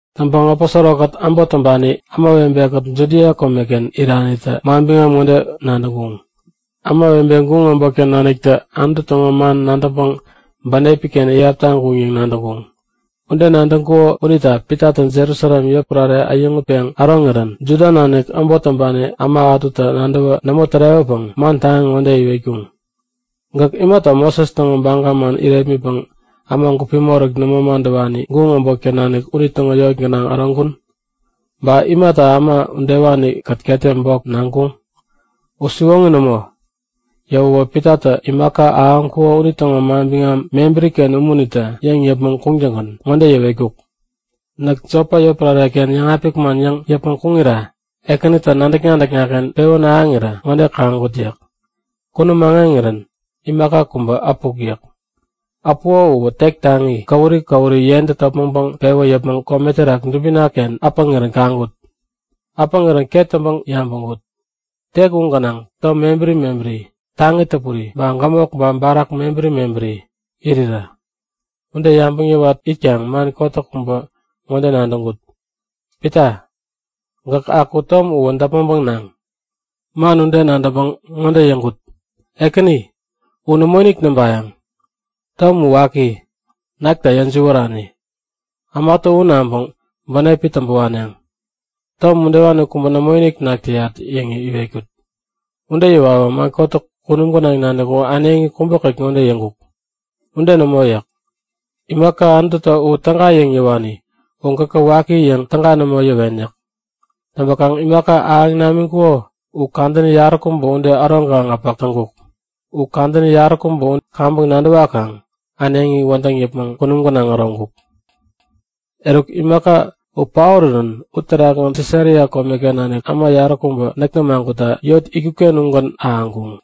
Täŋpäŋ aposoro-kät äbot täŋpani ämawebe-kät Judia komeken iranitä manbiŋam ŋode nadäŋkuŋ; Ämawebe guŋ äbotken naniktä Anutu täŋo man nadäŋpäŋ bänepi-ken iyap taŋkuŋ yäŋ nadäŋkuŋ. Ude nadäŋkuŋo unita Pitatä Jerusalem yotpärare äyäŋutpeŋ äroŋirän Juda nanik äbot täŋpani äma ätutä nadäwä nämo tärewäpäŋ man taŋi ŋode iwetkuŋ; Gäk imata Moses täŋo baga man irepmitpäŋ äma gupi moräk nämo madäwani, guŋ äbotken nanik unitäŋo yot gänaŋ äroŋkun? Ba imata äma udewani-kät ketem bok naŋkuŋ? U siwoŋi nämo! Yäwäwä Pitatä imaka ahäŋkuko unitäŋo manbiŋam mebäri-ken umunitä yäŋ yäpmäŋ kuŋtäŋgän ŋode yäwetkuk; Näk Jopa yotpärare-ken yäŋapik man yäŋ yäpmäŋ kuŋira Ekänitä nadäk-nadäkna-ken pewän ahäŋirä ŋode kaŋkut yäk. Kunum aŋeŋirän imaka kubä äpuk yäk. Äpuko uwä tek taŋi, käwuri käwuri yentä topmäŋpäŋ pewä yäpmäŋ kome terak dubina-ken äpäŋirän kaŋkut. Äpäŋirän ket täŋpäŋ yabäŋkut; Tek u gänaŋ tom mebäri mebäri taŋi täpuri, ba gämok ba barak mebäri mebäritä irirä. Ude yabäŋ yäwat itkaŋ man kotäk kubä ŋode nadäŋkut; Pita, gäk aku tom uwä däpmäŋpäŋ naŋ! Man ude nadäŋpäŋ ŋode yäŋkut; Ekäni, u nämoinik näŋpayäŋ. Tom u waki, nakta yäjiwärani. Ämatä u naŋpäŋ bänepi täŋpä waneŋ. Tom udewani kubä nämoinik nak täyat yäŋ iwetkut. Ude yäwawä man kotäk kunum gänaŋ nanik u äneŋi kubäkät ŋode yäŋkuk; Ude nämo yäk. Imaka Anututä u täga yäŋ yäwani u gäkä waki yäŋ täga nämo yäwen yäk. Täŋpäkaŋ imaka ahäŋ namiŋkuko u kadäni yaräkubä ude äroŋkaŋ äpäk täŋkuk. Kadäni yaräkubä u kaŋpäŋ nadäwakaŋ äneŋi wädäŋ yäpmäŋ kunum gänaŋ äroŋkuk. Eruk, imaka u paorirän uterakgän Sisaria komeken nanik äma yaräkubä näk nämagutta yot itkut-ken ugän ahäŋkuŋ.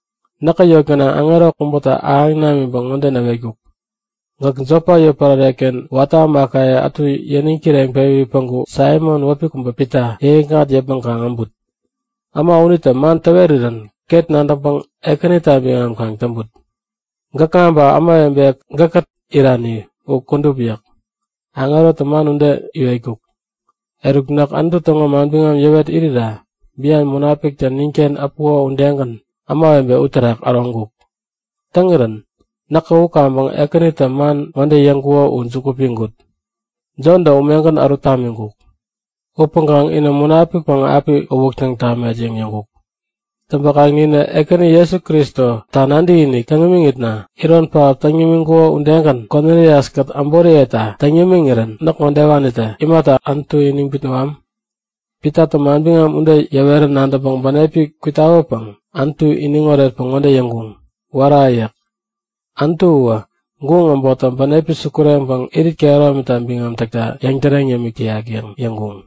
Näkä yot gänaŋ aŋero kubätä ahäŋ namiŋpäŋ ŋode näwetkuk; Gäk Jopa yotpärare-ken watä ämakaye ätu yäniŋ kireŋpewi päŋku Saimon wäpi kubä Pita yäŋikŋat yäpmäŋ kaŋ äbut. Äma unitä man täwerirän ket nadäŋpäŋ Ekänita biŋam kaŋ täŋput, gäkŋa ba ämawebe gäkkät irani u kudup yäk. Aŋerotä man ude iwetkuk. Eruk, näk Anutu täŋo manbiŋam yäwet irira bian Munapiktä ninken äpuko udegän ämawebe uterak äroŋkuk. Täŋirän näkä u kaŋpäŋ Ekänitä man ŋode yäŋkuko u juku piŋkut; Jontä umegän ärut tamiŋkuk. Upäŋkaŋ inä Munapikpäŋ api uwäktäŋ tamet yäŋ yäŋkuk. Täŋpäkaŋ ninä Ekäni Jesu Kristo nadäkinik täŋ imiŋitna iron pähap täŋ nimiŋkuko udegän Konilias-kät äboriyeta täŋ yämiŋirän näk ŋodewanitä imata Anutu iniŋ bitnäwam? Pitatä manbiŋam ude yäwerän nadäŋpäŋ bänepi kwitawäpäŋ Anutu iniŋ oretpäŋ ŋode yäŋkuŋ; Wära! yäk. Anutuwä guŋ äbottä bänepi sukureŋpäŋ irit kehäromita biŋam täkta yäŋtäreŋ yämik täyak yäŋ yäŋkuŋ.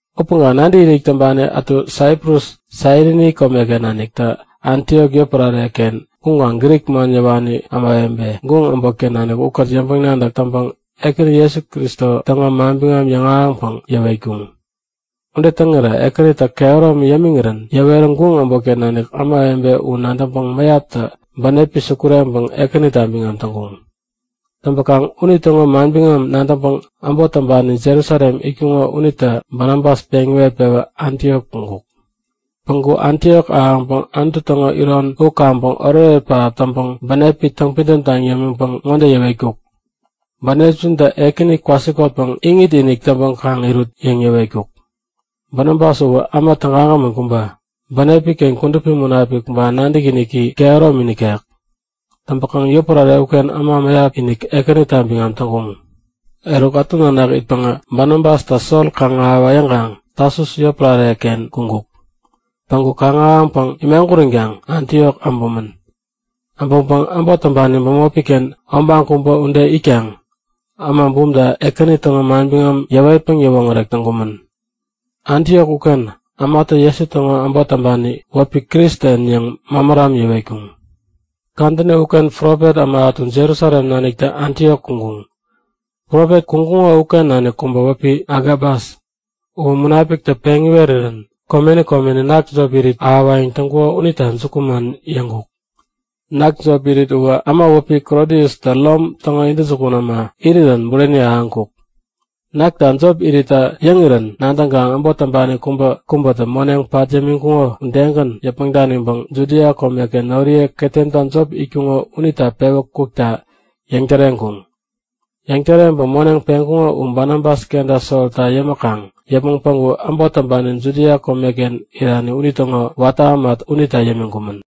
Upäŋkaŋ nadäkinik täŋpani ätu Saiprus Sairini komeken naniktä Antiok yotpärare-ken kuŋkaŋ Grik man yäwani ämawebe, guŋ äbotken nanik ukät yäŋpäŋ-nadäk täŋpäŋ Ekäni Jesu Kristo täŋo manbiŋam yäŋahäŋpäŋ yäwetkuŋ. Ude täŋirä Ekänitä kehäromi yämiŋirän yäwerä guŋ äbotken nanik ämawebe u nadäŋpäŋ mäyaptä bänepi sukureŋpäŋ Ekänita biŋam täŋkuŋ. Täŋpäkaŋ unitäŋo manbiŋam nadäŋpäŋ äbot täŋpani Jerusalem itkuŋo unitä Banabas peŋ iwet-pewä Antiok kuŋkuk. Päŋku Antiok ahäŋpäŋ Anutu täŋo iron u kaŋpäŋ oretoret pähap täŋpäŋ bänepi täŋpidäm taŋ yämiŋpäŋ ŋode yäwetkuk; Bänepjintä Ekäni kwasikotpäŋ iŋit-inik täŋpäŋ kaŋ irut yäŋ yäwetkuk. Banabas uwä äma tägagämän kubä. Bänepi-ken Kudupi Munapik ba nadäkiniki kehäromi nikek. Täŋpäkaŋ yotpärare uken äma mäyap-inik Ekänita biŋam täŋkuŋ. Eruk ätu nanak itpäŋä Banabastä Sol kaŋ-ahäwa yäŋkaŋ Tasus yotpärare-ken kuŋkuk. Päŋku kaŋ-ahäŋpäŋ imaguränkaŋ Antiok äbumän. Äbäŋpäŋ äbot täŋpani bämopi-ken obaŋ kubä ude itkaŋ äma bumta Ekäni täŋo manbiŋam yäwetpäŋ yäwoŋärek täŋkumän. Antiok uken ämatä Jesu täŋo äbot täŋpanita wäpi Kristen yäŋ mämäram yäwetkuŋ. Kadäni uken profet äma ätu Jerusalem naniktä Antiok kuŋkuŋ. Profet kuŋkuŋo uken nanik kubä wäpi Agabas, uwä Munapiktä peŋ iwerirän komeni komeni nak jop irit ahäwayäŋ täŋkuko unita jukuman yäŋkuk. (Nak jop irit uwä äma wäpi Klodiustä Rom täŋo intäjukun äma irirän bureni ahäŋkuk.) Nakta jop iritta yäŋirän nadäŋkaŋ äbot täŋpani kubäkubätä moneŋ pat yämiŋkuko udegän yäpmäŋ daniŋpäŋ Judia komeken noriye ketemta jop itkuŋo unita pewä kukta yäŋtäreŋkuŋ. Yäŋtäreŋpäŋ moneŋ peŋkuŋo u Banabas kenta Solta yämäkaŋ yäpmäŋ päŋku äbot täŋpani Judia komeken irani unitäŋo watä äma unita yämiŋkumän.